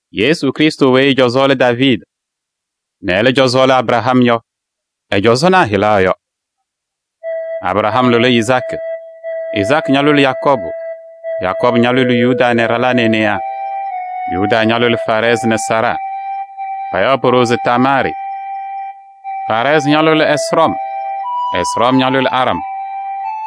Yesu Krɩstʋ weyi ɛ-cɔzɔ lɛ Daaviidi nɛ ɛlɛ cɔzɔ lɛ Abraham yɔ, ɛ-cɔzɔnaa hɩla yɔ: Abraham lʋlɩ Izaakɩ, Izaakɩ ñalʋlɩ Yakɔɔbʋ, Yakɔɔbʋ ñalʋlɩ Yuda nɛ ɛ-ɖalaa nɛ e-newaa. Yuda ñalʋlɩ Faarɛɛzɩ nɛ Zaaraa. Payaɣ po-ɖoo se Tamaarɩ. Faarɛɛzɩ ñalʋlɩ Ɛsrɔm, Ɛsrɔm ñalʋlɩ Aram,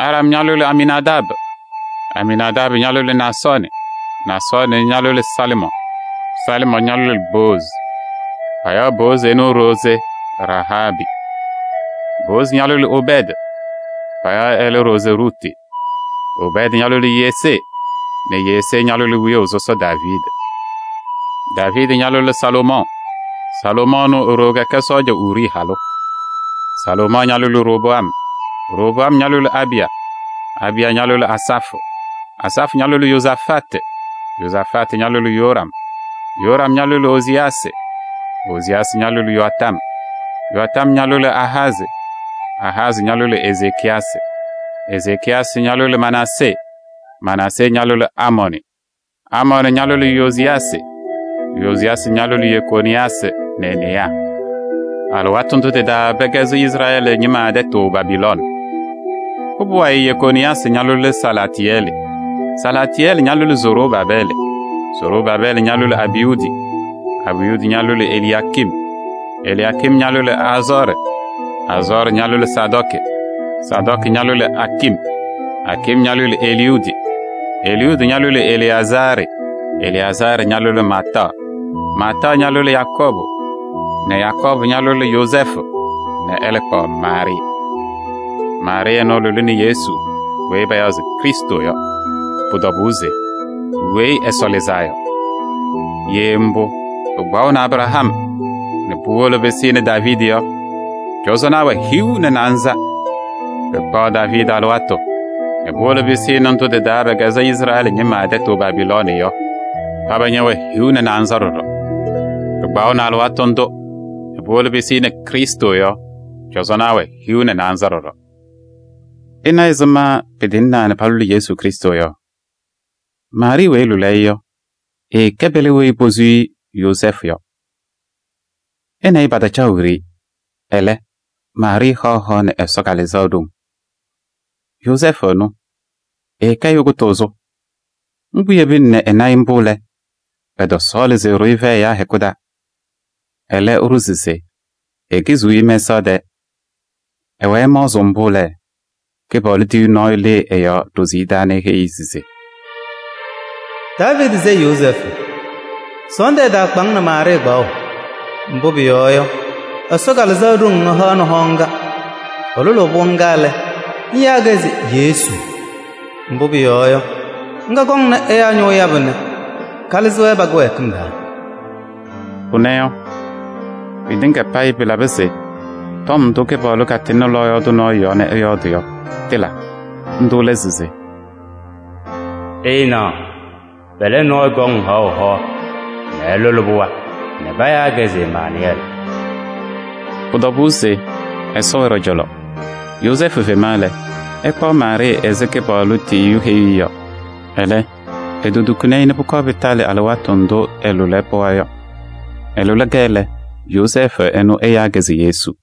Aram ñalʋlɩ Aminaadaabɩ, Aminaadaabɩ ñalʋlɩ Naasɔɔnɩ, Naasɔɔnɩ ñalʋlɩ Salɩmɔɔ, Salɩmɔɔ ñalʋlɩ Boozi. Payaɣ Boozi ɛnʋ e-ɖoo se Rahaabɩ. Boozi ñalʋlɩ Obɛɛdɩ. Payaɣ ɛlɛ ɖoo se Ruti. Obɛɛdɩ ñalʋlɩ Yesee nɛ Yesee ñalʋlɩ wiyaʋ sɔsɔ Daaviidi. Daaviidi ñalʋlɩ Salomɔɔ. Salomɔɔ ɛnʋ e-ɖoo kɛkɛ sɔɔja Urii halʋ. Salomɔɔ ñalʋlɩ Roboam, Roboam ñalʋlɩ Abiya, Abiya ñalʋlɩ Asafʋ, Asafʋ ñalʋlɩ Yozafatɩ, Yozafatɩ ñalʋlɩ Yoram, Yoram ñalʋlɩ Oziyaasɩ, Oziyaasɩ ñalʋlɩ Yoatam, Yoatam ñalʋlɩ Ahazɩ, Ahazɩ ñalʋlɩ Ezekiyasɩ, Ezekiyasɩ ñalʋlɩ Manaasee, Manaasee ñalʋlɩ Amɔɔnɩ, Amɔɔnɩ ñalʋlɩ Yoziyaasɩ, Yoziyaasɩ ñalʋlɩ Yekooniyaasɩ nɛ e-newaa. Alɩwaatʋ ndʋ tɩ-taa pɛkɛzɩ Izrɛɛlɩ ñɩma tɛtʋ Babilooni. Pʋbʋ wayɩ Yekooniyaasɩ ñalʋlɩ Salaatɩyɛlɩ, Salaatɩyɛlɩ ñalʋlɩ Zorobaabɛɛlɩ, Zorobaabɛɛlɩ ñalʋlɩ Abiyudi, Abiyudi ñalʋlɩ Eliyaakim, Eliyaakim ñalʋlɩ Azɔɔrɩ, Azɔɔrɩ ñalʋlɩ Sadɔɔkɩ, Sadɔɔkɩ ñalʋlɩ Akim, Akim ñalʋlɩ Eliyudi Eliyudi ñalʋlɩ Eleyazaarɩ, Eleyazaarɩ ñalʋlɩ Maataɣ, Maataɣ ñalʋlɩ Yakɔɔbʋ nɛ Yakɔɔbʋ ñalʋlɩ Yozɛɛfʋ nɛ ɛlɛ kpaɣ Maarɩɩ. Maarɩɩ ɛnʋ ɛlʋlɩnɩ Yesu weyi payaɣ se Krɩstʋ yɔ, pʋ-tɔbʋʋ se Weyi Ɛsɔ Lɩzaa Yɔ. Ye mbʋ, pɩkpaɣʋnɩ Abraham nɛ puwolo pɩsɩnɩ Daaviidi yɔ, cɔzɔnaa wɛ hiu nɛ naanza. Pɩkpaɣ Daaviidi alɩwaatʋ nɛ puwolo pɩsɩnɩ ndʋ tɩ-taa pɛkɛzɩ Izrɛɛlɩ ñɩma tɛtʋ Babiloon yɔ, paba ñɛwɛ hiu nɛ naanza ɖɔɖɔ. Pɩkpaɣʋnɩ alɩwaatʋ ndʋ nɛ puwolo pɩsɩnɩ Krɩstʋ yɔ, cɔzɔnaa wɛ hiu nɛ naanza ɖɔɖɔ. Ɩna ɛzɩma pɩtɩŋaa nɛ palʋlɩ Yesu Krɩstʋ yɔ. Maarɩɩ weyi ɛlʋlɩ-ɩ yɔ, ɛɛkɛ pɛlɛ weyi posu Yozɛɛfʋ yɔ. Ɛ nɛ ɩ pataacaɣ wiɖiyi. Ɛlɛ, Maarɩɩ haɣ hoa nɛ Ɛsɔ Kalɩzaɣ ɖoŋ. Yozɛɛfʋ ɛnʋ, ɛkɛ ɛyʋ kʋtʋʋzʋ. Mbʋ yebina nɛ ɛna-ɩ mbʋ lɛ, ɛtɔsɔɔlɩ se ɛɖʋ-ɩ fɛyɛ ɛyaa hɛkʋ taa. Ɛlɛ ɛɖʋ se ekiziɣ-i mɛsaɣ tɛɛ. Ɛwɛɛ ɛmaɣzɩɣ mbʋ lɛ, Kɩpaɣlʋ tiyiyu nɔɔyʋ lɩɩ ɛ-yɔɔ ɖoziye taa nɛ eheyi-i se: “Daaviidi sayɩ Yozɛɛfʋ! Sɔɔndʋ ɛtaakpa-ŋ nɛ Maarɩɩ kpaɣʋ. Mbʋ pʋyɔɔ yɔ, Ɛsɔ Kalɩzaɣ ɖoŋ ɛhaɣnɩ hoa ŋga. Ɛlʋlʋʋ pɩɣa ŋga lɛ, ŋyaa-kɛ se Yesu, mbʋ pʋyɔɔ yɔ, ŋga kɔŋnɩ ɛyaa ñʋʋ yabʋ nɛ kalɩzɩ-wɛ pa-kɩwɛɛkɩm taa.” Pʋnɛ yɔ, pɩtɩŋa payɩ pɩlabɩ se tɔm ndʋ Kɩpaɣlʋ katɩŋnɩ lɔɔyaɣ tʋ nɔɔyʋ yɔɔ nɛ ɛyɔɔdɩ yɔ, tɩla. Ndʋ lɛ se: “Ɩnaɣ, pɛlɛ nɔɔyʋ kɔŋ haɣʋ nɛ ɛlʋlɩ pɩɣa nɛ payaa-kɛ se Emaanʋyɛɛlɩ.” Pʋ-tɔbʋʋ se Ɛsɔ wɛ ɖɔ-cɔlɔ. Yozɛɛfʋ fema lɛ, ɛkpaɣ Maarɩɩ ɛzɩ Kɩpaɣlʋ tiyiyu heyuu-i yɔ. Ɛlɛ, etotukini-i nɛ pʋkɔɔ pɩsɩnɩ alɩwaatʋ ndʋ ɛlʋlɩ ɛ-pɩɣa yɔ. Ɛlʋlɩ-kɛ lɛ, Yozɛɛfʋ ɛnʋ ɛyaa-kɛ se Yesu.